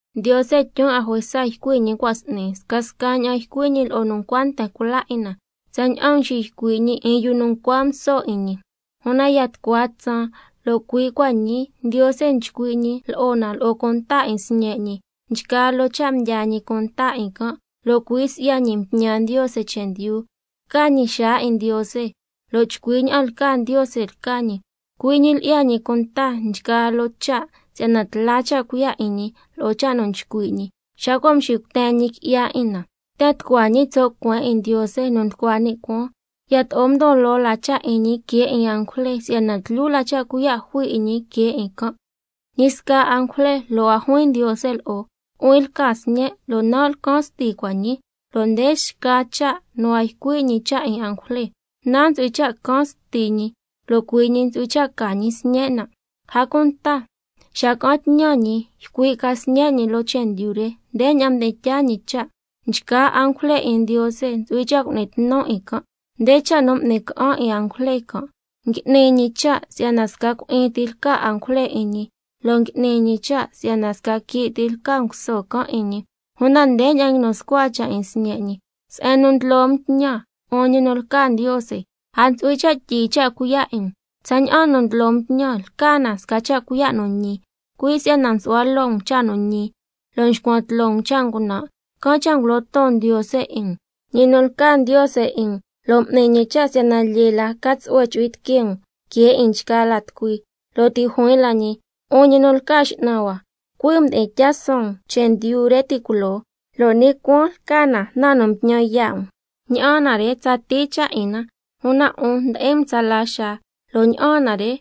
Ndiose tyun 'a juesa ycui' ñi cua' s'ni, scasca ña'an ycui' ñi lo'o nu ncua nten cula 'in na tsaña'an mxiycui' ñi 'in yu ncua nguso 'in ñi, una ya tucua tsaan, lo' cui' cua' ñii, Ndiose nchcui' ñi lo'o na lo'o cunta 'in Sñe' ñi, nchgaa loo cha' mdyaa ñi cunta 'in can', lo' cui' si'ya ñi mtñan Ndiose chendyu, lca ñi xaa 'in Ndiose, lo' chcui ña'an lca Ndiose lca ñi, cui' ñi lyi'ya ñi cunta nchgaa loo cha' si'yana tla cha' cuiya' 'in ñi lo'o cha' nu nchcui' ñi. Xa cua' mxicuten ñi qui'ya 'in na —yten tucua ñi tso' cueen 'in Ndiose nu nducua ni' cuaan—. Yato'o ndon loo la cha' 'in ñi que 'in angujle, si'yana tlyu la cha' cuiya' jui 'in ñi que 'in can'. Si'yana ñi sca angujle lo' a juin Ndiose lo'o: —Nu'huin lca Sñen', lo' nan' lcan Sti cua' ñii—, lo' nde xca cha' nu a ycui' ñi cha' 'in angujle: —Nan' ntsu'hui cha' can Sti ñi, lo' cui' ñi ntsu'hui cha' ca ñi sñen' nan'—. A cunta xa ca'an tñan ñi ycui' ca Sñe' ñi loo chendyu re, ndeña'an mdi'in tyaa ñi cha': —Nchgaa angujle 'in Ndiose ntsu'hui cha' cu'ni tnu 'in can'—. Nde cha' nu m'ni ca'an 'in angujle can': —Ngui'ni ñi cha' si'yana sca cui'in ti lca angujle 'in ñi, lo' ngui'ni ñi cha' si'yana sca quii' ti lca nguso can' 'in ñi—. Una ndeña'an nguinu scua cha' 'in Sñe' ñi: —Se'en nu ndlo um tñan, 'un ñi nu lca Ndiose, a ntsu'hui cha' tyii cha' cuiya' 'in um. Tsaña'an nu ndlo um tñan lca na sca cha' cuiya' nu ñi. Cui' si'yana nsu'hua loo um cha' nu ñi, lo' nxcuan tloo um cha' ngunan', can' cha' ngulo ton Ndiose 'in um, ñi nu lca Ndiose 'in um, lo' m'ni ñi cha' si'yana lyee la ca tsu'hue chu'hui tiquee um que 'in nchgaa la tucui—. Lo' ti' juin la ñi: —'Un ñi nu lca X'nan hua, cui' um mdi'in tyaa suun um chendyu re ti' culoo, lo' ni' cuaan lca na nu mtñan yaa' um. Ña'aan na re tsatii cha' 'in na, una 'un ndi'in um tsala xaa, lo' ña'aan na re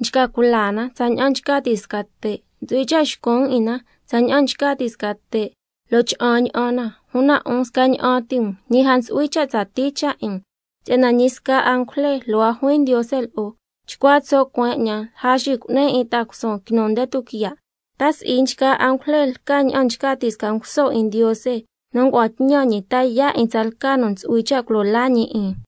nchca cula na tsaña'an nchca ti' sca te', ntsu'hui cha' xcun' 'in na tsaña'an nchca ti' sca te', lo' cha'an ña'an na, una 'un scaña'an ti um, ñi a ntsu'hui cha' tsatii cha' 'in um—. Si'yana ñi sca angujle lo' a juin Ndiose lo'o: —Chcua tso' cueen 'ñan lja xicu'nin 'in ta'a cusuun quinu nde tuquiya'—. ¿Ta si'i nchgaa angujle lca ña'an nchca ti' sca nguso 'in Ndiose nu ngua'an tñan ñi ta yaa' 'in tsalca nu ntsu'hui cha' culo laa ñi 'in?